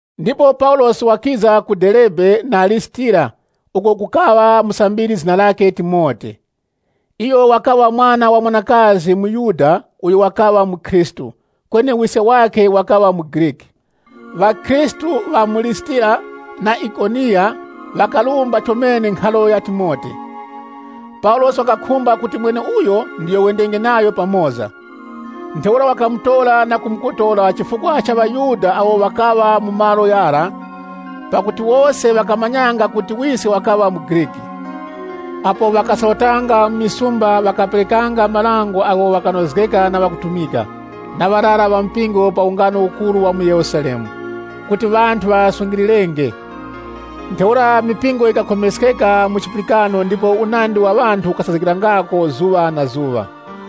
Ndipo Paulosi wakiza ku Derebe na ku Lisitira, uko kukaŵa musambiri zina lakhe Timote. Iyo wakaŵa mwana wa mwanakazi muYuda uyo wakaŵa mukhristu, kweni wiske wakaŵa muGriki. Ŵakhristu ŵa mu Lisitira na Ikoniya ŵakarumba chomene nkharo ya Timote. Paulosi wakakhumba kuti mweneuyo ndiyo wendenge nayo pamoza. Ntheura wakamutora na kumukotora chifukwa cha ŵaYuda awo ŵakaŵa mu malo ghara pakuti wose ŵakamanyanga kuti wiske wakaŵa muGriki. Apo ŵakasorotanga mu misumba, ŵakaperekanga marango agho ghakanozgeka na ŵakutumika na ŵarara ŵa mpingo pa ungano ukuru wa mu Yerusalemu, kuti ŵanthu ŵaghasungilirenge. Ntheura mipingo yikakhomeskeka mu chipulikano ndipo unandi wa ŵanthu ukasazgikirangako zuŵa na zuŵa.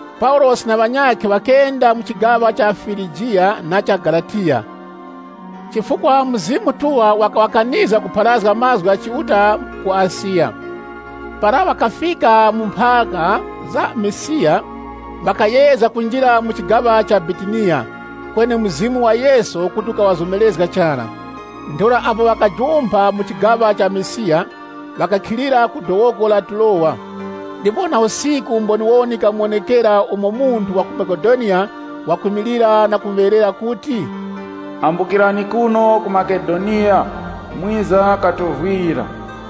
Paulosi na ŵanyakhe ŵakenda mu chigaŵa cha Firigiya na cha Galatiya, chifukwa Mzimu Mutuŵa wakaŵakanizga kupharazga mazgu gha Chiuta ku Asiya. Para ŵakafika mu mphaka za Misiya, ŵakayezga kunjira mu chigaŵa cha Bitiniya, kweni Mzimu wa Yesu kuti ukaŵazomerezga chara. Ntheura apo ŵakajumpha mu chigaŵa cha Misiya, ŵakakhilira ku dowoko la Turowa. Ndipo na usiku mboniwoni yikamuwonekera umo munthu wa ku Makedoniya wakwimilira na kumuŵeyerera kuti, “Ambukirani kuno ku Makedoniya mwiza katovwira!”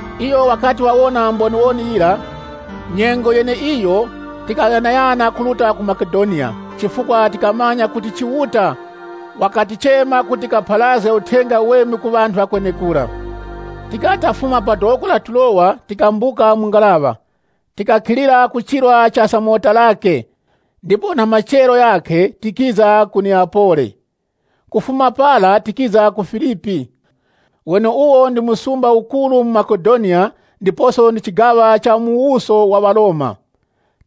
Iyo wakati wawona mboniwoni yira, ise tikaghanaghana kuruta ku Makedoniya nyengo yeneiyo, chifukwa tikamanya kuti Chiuta wakatichema kuti tikapharazge Uthenga Uweme ku ŵanthu ŵa kwenekura. Tikati tafuma pa dowoko la Turowa tikambuka mu ngaraŵa, tikakhilira ku chirwa cha Samotirake, ndipo na machero ghakhe tikiza ku Neyapoli. Kufuma para tikiza ku Filipi, weneuwo ndi msumba ukuru mu Makedoniya ndiposo ndi chigaŵa cha mu muwuso wa ŵaRoma.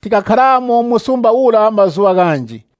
Tikakharamo mu msumba ura mazuŵa ghanji.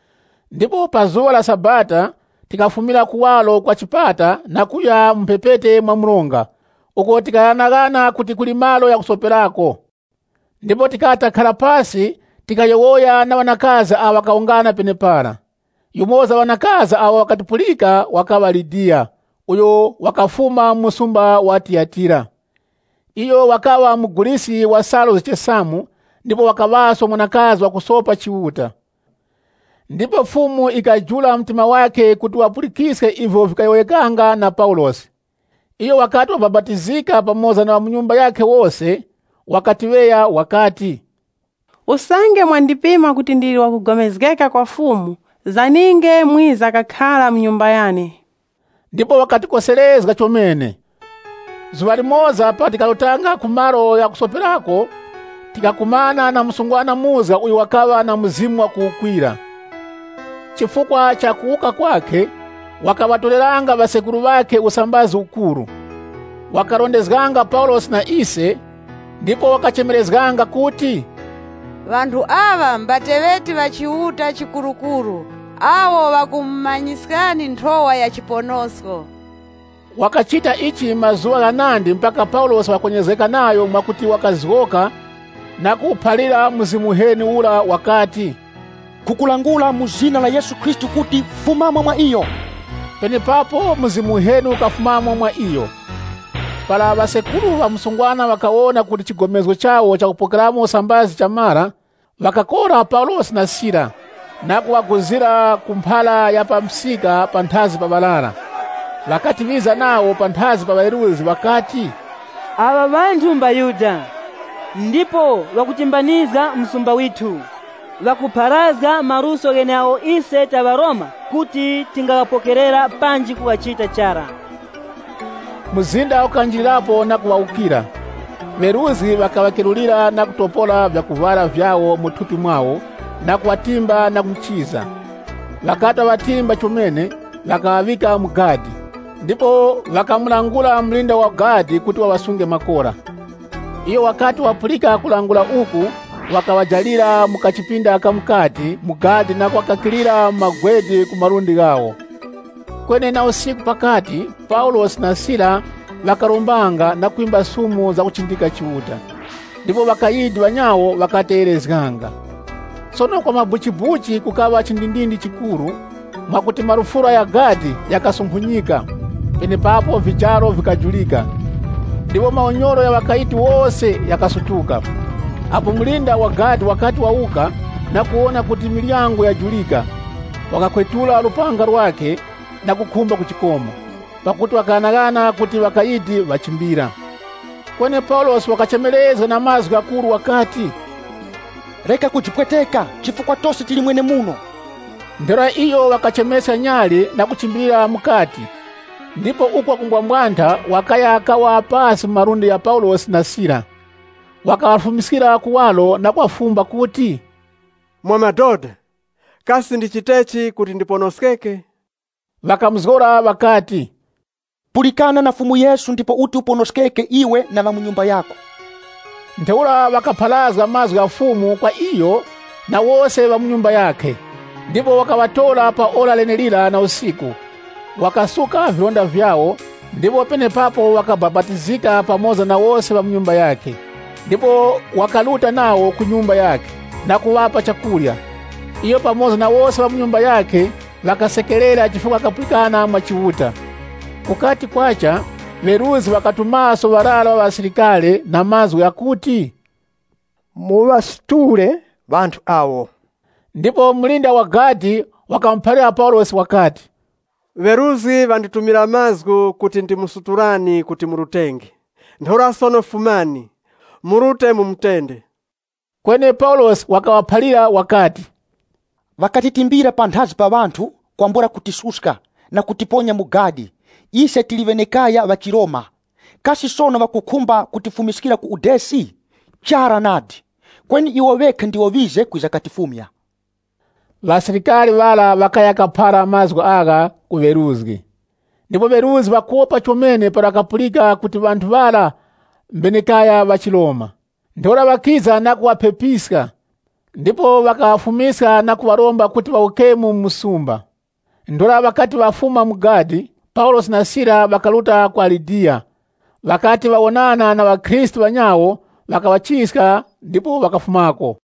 Ndipo pa zuŵa la Sabata tikafumira kuwaro kwa chipata na kuya mu mphepete mwa mronga, uko tikaghanaghananga kuti kuli malo ghakusoperako. Ndipo tikati takhara pasi tikayowoya na ŵanakazi awo ŵakawungana penepara. Yumoza wa ŵanakazi awo ŵakatipulika wakaŵa Lidiya uyo wakafuma mu msumba wa Tiyatira. Iyo wakaŵa muguliski wa salu zichesamu ndipo wakaŵaso mwanakazi wakusopa Chiuta. Ndipo Fumu yikajula mtima wakhe kuti wapulikiske ivyo vikayowoyekanga na Paulosi. Iyo wakati wabapatizika pamoza na ŵa mu nyumba yakhe wose, wakatiŵeya wakati, “Usange mwandipima kuti ndili wakugomezgeka kwa Fumu, zaninge mwiza kakhara mu nyumba yane.” Ndipo wakatikoserezga chomene. Zuŵa limoza para tikarutanga ku malo ghakusoperako tikakumana na msungwana muzga uyo wakaŵa na mzimu wakuwukwira. Chifukwa cha kuwukwa kwakhe, wakaŵatoreranga ŵasekuru ŵakhe usambazi ukuru. Wakarondezganga Paulosi na ise, ndipo wakachemerezganga kuti, “Ŵanthu aŵa mbateŵeti ŵa Chiuta Chikurukuru awo ŵakumumanyiskani nthowa ya chiponosko!” Wakachita ichi mazuŵa ghanandi mpaka Paulosi wakakwenyerezgeka nayo mwakuti wakazgoka na kuwuphalira mzimu “Nkhukulangula mu zina la Yesu Khristu kuti, fumamo mwa iyo.” Penepapo mzimu uheni ukafumamo mwa iyo. Para ŵasekuru ŵa msungwana ŵakawona kuti chigomezgo chawo chakupokeramo usambazi chamara, wakakora Paulosi na Sila, na kuŵaguzira ku mphara ya pa msika panthazi pa ŵarara. Ŵakati ŵiza nawo panthazi pa ŵeruzgi ŵakati, “Aŵa ŵanthu mbaYuda, ndipo ŵakutimbanizga msumba withu. Ŵakupharazga maluso gheneagho ise ta ŵaRoma kuti tingaghapokerera panji kughachita chara.” Mzinda ukanjirirapo na kuŵawukira. Ŵeruzgi ŵakaŵakerulira na kutopora vyakuvwara vyawo mu thupi mwawo na kuŵatimba na michiza. Ŵakati ŵaŵatimba chomene, ŵakaŵaŵika mu gadi, ndipo ŵakamulangula mulinda wa gadi kuti waŵasunge makora. Iyo wakati wapulika kulangula uku, wakaŵajalira mu kachipinda ka mukati mu gadi na kuŵakakilira magwede ku malundi ghawo. Kweni na usiku pakati, Paulosi, na Sila ŵakarombanga na kwimba sumu za kuchindika Chiuta, ndipo ŵakayidi ŵanyawo ŵakategherezganga. Sono kwa mabuchibuchi kukaŵa chindindindi chikuru, mwakuti malufura gha gadi ghakasunkhunyika. Penepapo vijaro vikajurika ndipo maunyoro gha ŵakayidi wose ghakasutuka. Apo mulinda wa gadi wakati wawuka, na kuwona kuti miryango yajurika, wakakhwetula lupanga lwakhe, na kukhumba kujikoma, pakuti wakaghanaghana kuti ŵakayidi ŵachimbira. Kweni Paulosi wakachemerezga na mazgu ghakuru wakati, “Reka kujipweteka, chifukwa tose tili mwenemuno!” Ntheura iyo wakachemeska nyali na kuchimbilira mukati ndipo uko wakumbwambwantha wakaya kawa pasi mu malundi gha Paulosi na Sila. Wakaŵafumiskira kuwaro na kuŵafumba kuti, “Mwa madoda, kasi ndichitechi kuti ndiponoskeke?” Ŵakamuzgora ŵakati, “Pulikana na Fumu Yesu ndipo uti uponoskeke iwe na ŵa mu nyumba yako.” Ntheura ŵakapharazga mazgu gha Fumu kwa iyo na wose ŵa mu nyumba yakhe. Ndipo wakaŵatora pa ora lenelira la usiku, wakasuka vilonda vyawo, ndipo penepapo wakabapatizika pamoza na wose ŵa mu mbumba yakhe. Ndipo wakaruta nawo ku nyumba yakhe, na kuŵapa chakurya. Iyo pamoza na wose ŵa mu nyumba yakhe, ŵakasekerera chifukwa ŵakapulikana mwa Chiuta. Kukati kwacha, ŵeruzgi ŵakatumaso ŵarara ŵa ŵasilikari na mazgu ghakuti, “Muŵasutule ŵanthu awo.” Ndipo mulinda wa gadi wakamuphalira Paulosi wakati, “Ŵeruzgi ŵanditumira mazgu kuti ndimusutulani kuti murutenge. Ntheura sono fumani, murute mu mutende.” Kweni Paulosi wakaŵaphalira wakati, “Ŵakatitimbira panthazi pa ŵanthu, kwambula kutisuska, na kutiponya mu gadi, ise tili ŵenekaya ŵa chiRoma. Kasi sono ŵakukhumba kutifumiskira ku udesi? Chara nadi! Kweni iwo ŵekha ndiwo ŵize kwiza katifumya.” Ŵasilikari ŵara ŵakaya kaphara mazgu agha ku ŵeruzgi, ndipo ŵeruzgi ŵakopa chomene para ŵakapulika kuti ŵanthu ŵara mbenekaya ŵa chiRoma. Ntheura ŵakiza na kuŵaphepiska. Ndipo ŵakaŵafumiska na kuŵaromba kuti ŵawukemo mu msumba. Ntheura ŵakati ŵafuma mu gadi, Paulosi na Sila ŵakaruta kwa Lidiya. Ŵakati ŵawonana na ŵakhristu ŵanyawo ŵakaŵachiska ndipo ŵakafumako.